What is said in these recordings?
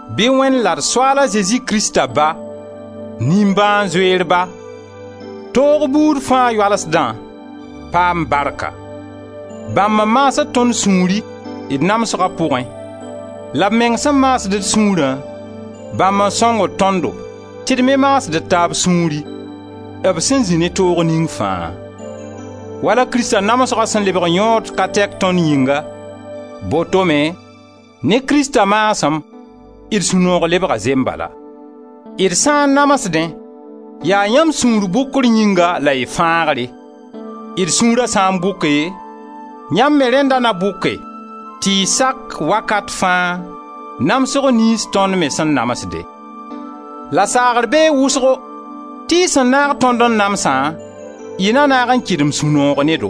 Bɩ Wẽnd la d Soaal a Zezi Krista Ba, nimbãan-zoeer Ba, toog buud fãa yoalsdã, paam barka! Bãmb n maasd tõnd sũuri d namsga pʋgẽ, la b meng sẽn maasd d sũurã, bãmb n sõngd tõndo tɩ d me maasd d taab sũuri, b sẽn zĩ ne toog ning fãa. Wala Krista namsga sẽn lebg yõod ka tɛk tõnd yĩnga, boto me, ne Krista maasem, d sũ-noog lebga zembala. D sã n namsdẽ, yaa yãmb sũur bʋkr yĩnga la y fãagre. D sũura sã n bʋke, yãmb me rẽnda na bʋke tɩ y sak wakat fãa, namsg niyns tõnd me sẽn namsde. La saagr bee wʋsgo tɩ y sẽn naag tõnd n namsã, y na naag n kɩdem sũ-noog ne do.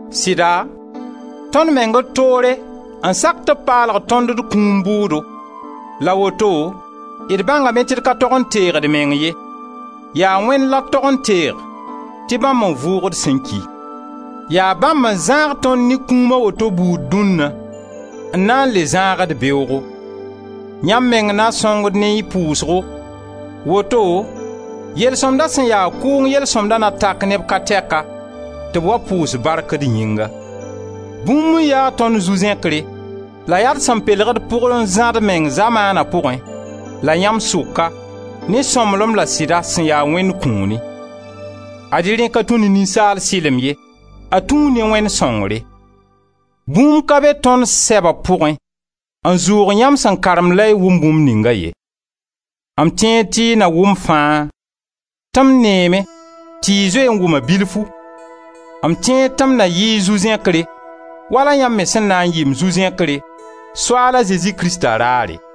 Sɩda tõnd meng d toore n sak tɩ b paalg tõnd d kũum bʋʋdo la woto d bãngame tɩ d ka tog n teeg d meng ye. Yaa Wẽnd la d tog n teeg tɩ bãmb n vʋʋgd sẽn ki. Yaa bãmb n zãag tõnd ne kũum a woto buud dũnna, n na n le zãag-d beoogo. Yãmb meng na sõngd ne y pʋʋsgo, woto yel-sõmda sẽn ya kʋʋng yel-sõmdã na tak neb ka tɛka tɩ b wa pʋʋs bark d yĩnga. Bũmb n ya tõnd zu-zẽkre la yaa d sẽn pelg d pʋg n zã d meng zamaana pʋgẽ la yãmb sʋka ne sõmblem la sɩda sẽn ya Wẽnd kũuni. Ad-y rẽ ka tũ ne ninsaal sɩlem ye, a tũu ne Wẽnd sõngre. Bũmb ka be tõnd sɛba pʋgẽ n zʋʋg yãmb sẽn karemd la y wʋmd bũmb ninga ye. M tẽed tɩ y na wʋm fãa — tɩ m neeme tɩ y zoe n wʋma bilfu — m tẽed tɩ m na yɩ y zu-zẽkre wala yãmb me sẽn na n yɩ m zu-zẽkre Soaal a Zezi Krista raare.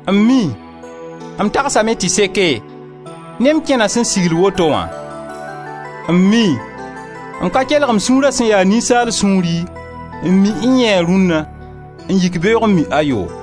M mii, m tagsame tɩ seke ne m kẽna sẽn sigl woto wã? M mii, m ka kelg m sũura sẽn ya ninsaal sũuri n mi N-yẽe rũnna n yik beoog n mi Ayoo?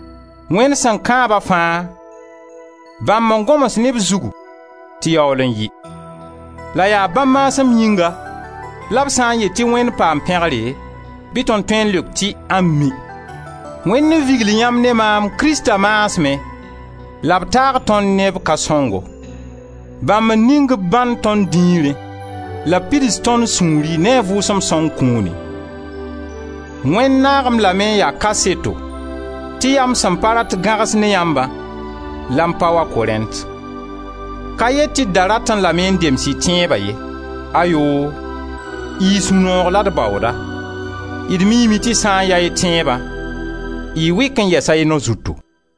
Wẽnd sẽn kãaba fãa, bãmb n gõms ne b zugu tɩ yaool n yɩ, la yaa bãmb maasem yĩnga la b sã n yet tɩ Wẽnd paam pẽgre bɩ tõnd tõe n leok tɩ: Ami! Wẽnd n vigl yãmb ne maam Krista maasmẽ la b taag tõnd ne b ka-sõngo. Bãmb n ning b bãnd tõnd dĩirẽ la b pids tõnd sũuri ne a Vʋʋsem Sõng kũuni. Wẽnd naag-m lame n ya kaseto tɩ yaa m sẽn pa rat gãgs ne yãmbã la m pa wa Korẽnt. Ka yet tɩ d da ratẽ lame n dems y tẽeba ye. Ayoo! Y sũ-noog la d baooda; d miime tɩ sã n ya y tẽeba, y wɩk n yɛsa y nao zutu.